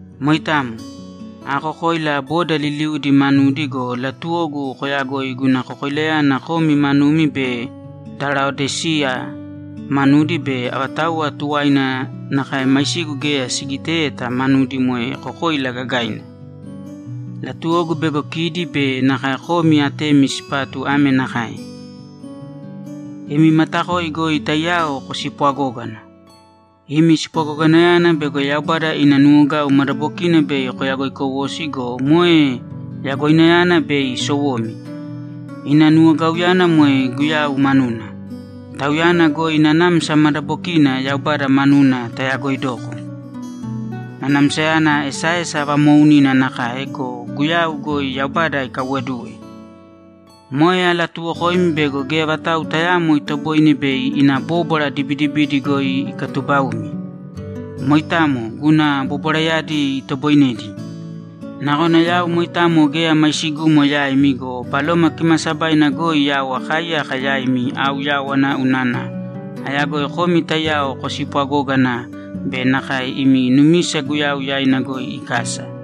Moitamo. Aakokoila boda liliudi manudi go, latuwogu koyagoi guna kokoilayana komi manumi be da Laodiseya manudi be avatauwa tuwaina nakae maisigu geya sigiteyeta manudi moe kokoila gagaina. Latuwogu bego kidi be nakae komi atemi sipatu ame nakae: Imi matakoi goi taiyao kospwagōgana. Imi spwagoganayana bego Yaubada ina nuwogau madabokina bei koyagoikowosi go, moe yagoinayana bei sowomi. Ina nuwogauyana moe Guyau manuna. Tauyana goi nanamsa madabokiina Yaubada manuna tayagoidoko; nanamsayana esaesa vamoounina nakae go, Guyau goi Yaubada ikaiwoduwe. Moe alatuuwokoimi bego geya vatau tayaamo itoboine bei ina bóbwara dibidibidi goi ikatuubaumi. Moitamo, guna bobwarayadi itoboinedi. Nakona yau moitamo geya maisigumo yaimi go, Baloma Kimaasabaina goi yau akaaiyaka yaimi aauyáwana unana ayagoi komi taiyao kospwagógana be nakae imi numisa Guyau yaina goi ikasa.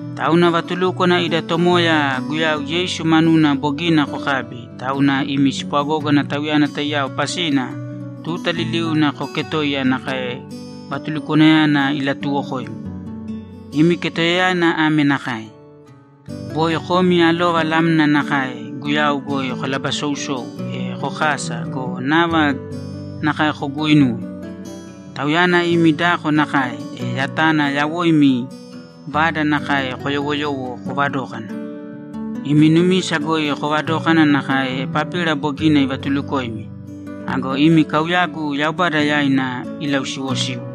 Tauna vatulúkwana ida Tomoya Guyau Yeisu manuna bogina kokabi, tauna imi spwagógana Tauyana taiyao pasina tuta liliuna kooketōiya nakae vatulukwanayana ilatuuwokoimi. Imi ketoiyayana ame nakae: Boi komi alova lamna nakae Guyau goi kolabasousou, e kokasa go, nava nakae koguuinūwe. Tauyana imi dako nakae, e yatana yawoimi vada nakae koyowoyōwo kovadōkana. Imi numisa goi kovadōkana nakae Epapira bogina ivatulukoimi. Ago imi kauyagu Yaubada yaina ilausiwosīwo.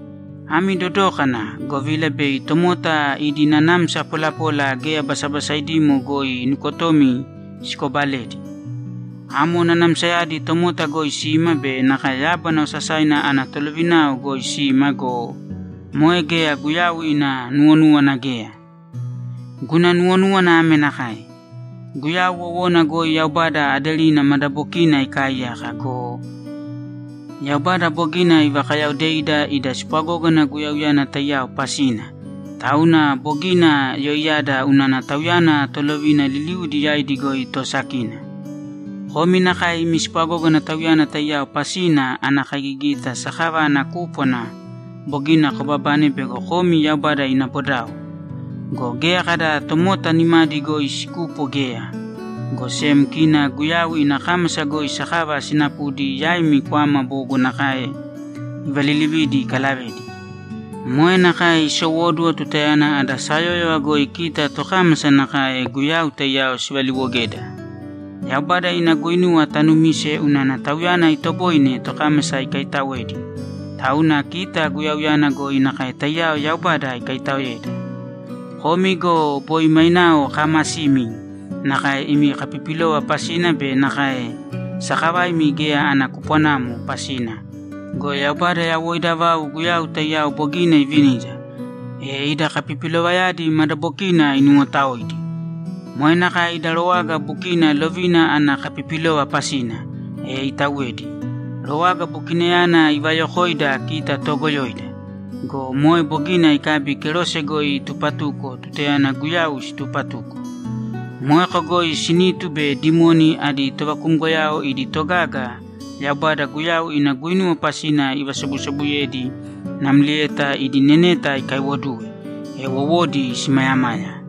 Ami dodōkana, govila bei tomota idi nanamsa polapola geya basabasaidimo goi nukotomi sikobaledi. Amo nanamsayadi tomota goi sima be nakae yábana osasaina ana tolovinao goi sima go, moe geya Guyau ina nuwonúwana geya. Guna nuwonúwana ame nakae: Guyau wowona goi Yaubada aderina madabokiina ikaaiyaka go, Yaubada bogina ivakayaodeida ida spwagógana Guyauyana taiyao pasina, tauna bogina yoiyada unana Tauyana tolovina liliudi yaidi goi toosakina. Komi nakae imi spwagógana Tauyana taiyao pasina ana kaigigita sakava ana kúpwana bogina kobabane bego komi Yaubada ina bodao. Go geya kada tomota nimadi goi sikupo geya, go sem kina Guyau ina kámasa goi sakava sinapudi yaimi kwama bogo nakae ivalilividi ikalavedi. Moe nakae isowóduwo tutayana ada sayóyova goi kita tokámasa nakae Guyau taiyao sivaliwogeda. Yaubada ina guinuwa tanumise unana Tauyana itoboine tokámasa ikaitaoedi, tauna kita Guyauyana goi nakae taiyao Yaubada ikaitaoeda. Komi go boi mainao kaamasimi nakae imi kapipilova pasina be nakae sakavaimi geya ana kupwanamo pasina go, Yaubada yawoida vau Guyau taiyao bogina ivinida, e ida kapipilovayadi madabokina inuwotaoidi. Moe nakae ida rowaga bukina lovina ana kapipilova pasina, e itauwedi; rowaga bukinayana ivayokoida kita toogoyoida go, moe bogina ikabi kerose goi itupatuko tutayana Guyau situpatuko. Moeko goi sinitu be dimoni adi tovakumgoyao idi togaga Yaubada Guyau ina guinuwa pasina ivasobusobuyedi namlieta idi neneta ikaiwoduwe, e wowodi simayamaya.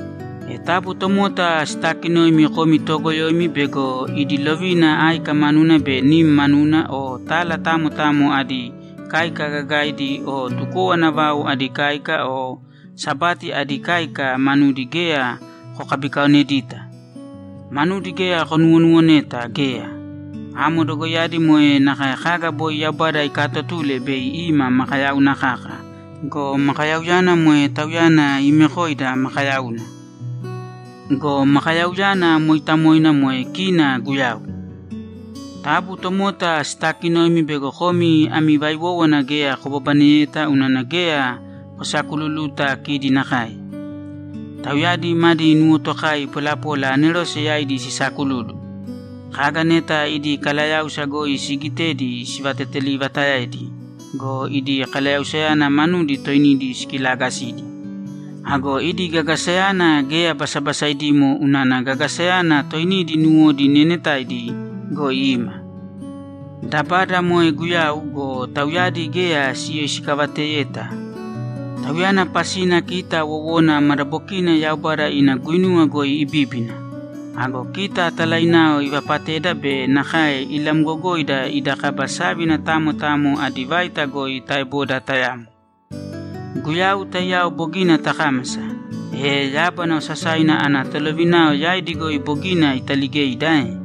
E taabu tomota sitaakinōimi komi toogoyoimi bego idi lovina áika manuna be nim manuna, o tala tamo tamo adi káika gagaidi o tukowana vau adi káika o Sabati adi káika manudi geya kokabikaonedita. Manudi geya konuwonuwoneta geya. Amo dogoiyadi moe nakae kaga boi Yaubada ikatotule bei ima makayauna kaka go, makayauyana moe Tauyana iimekoida makayauna. Go Makayauyana mooitamoina moe kina Guyau! Taabu tomota sitaakinōimi bego komi ami vaiwowana geya kobabaneyeta unana geya kosakululuta kidi nakae. Tauyadi madi nuwotokai polapola anerose yaidi sisaakululu. Kaga neta idi kalayáusa goi siigitedi sivateteliivataedi go, idi kalayausayadi manudi toinidi sikilaagasidi. Ago idi gagasayana geya basabasainamo unana gagasayana toinidi nuwodi neenetaidi goi ima. Dabada moe Guyau go, tauyadi geya siyoisikavateyeta. Tauyana pasina kita wowona madabokina Yaubada ina guinuwa goi ibíbina. Ago kita talainao ivapateda be nakae ilamgogoida ida kaba sávina tamo tamo adi vaita goi taeboda tayamo. Guyau taiyao bogina takámasa, e yábana osasaina ana tolovinao yaidi goi bogina italigeida ae?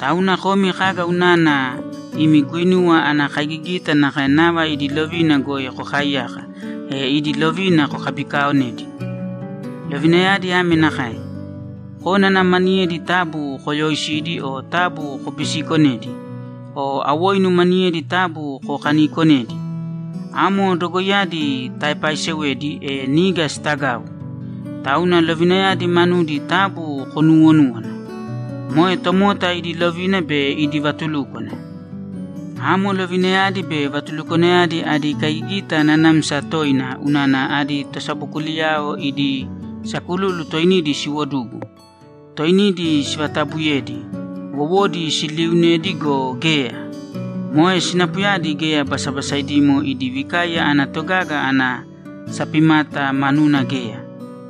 Tauna komi kaga unana imi guinuwa ana kaigigita nakae nava idi lovina goi kokaaiyaka, e idi lovina kokabikaaonedi? Lovinayadi ame nakae: Kónana maniyedi taabu kooyoisīdi o taabu kobisiikonēdi. O awoinu maniyedi taabu kokaniikonēdi. Amo dogoiyadi taepaisewedi, e niga sitagau. Tauna lovinayadi manudi taabu konuuwonūwana. Moe tomota idi lovina be idi vatulúkwana. Amo lovinayadi be vatulukwanayadi adi kaigigita nanamsa toina unana adi tosabokuliyao idi sakululu toinidi siwodugu, toinidi sivatabuyedi, wowodi siliiunedi go, geya. Moe sinapuyadi geya basabasaidimo idi vikaiya ana togaga ana sapimata manuna geya.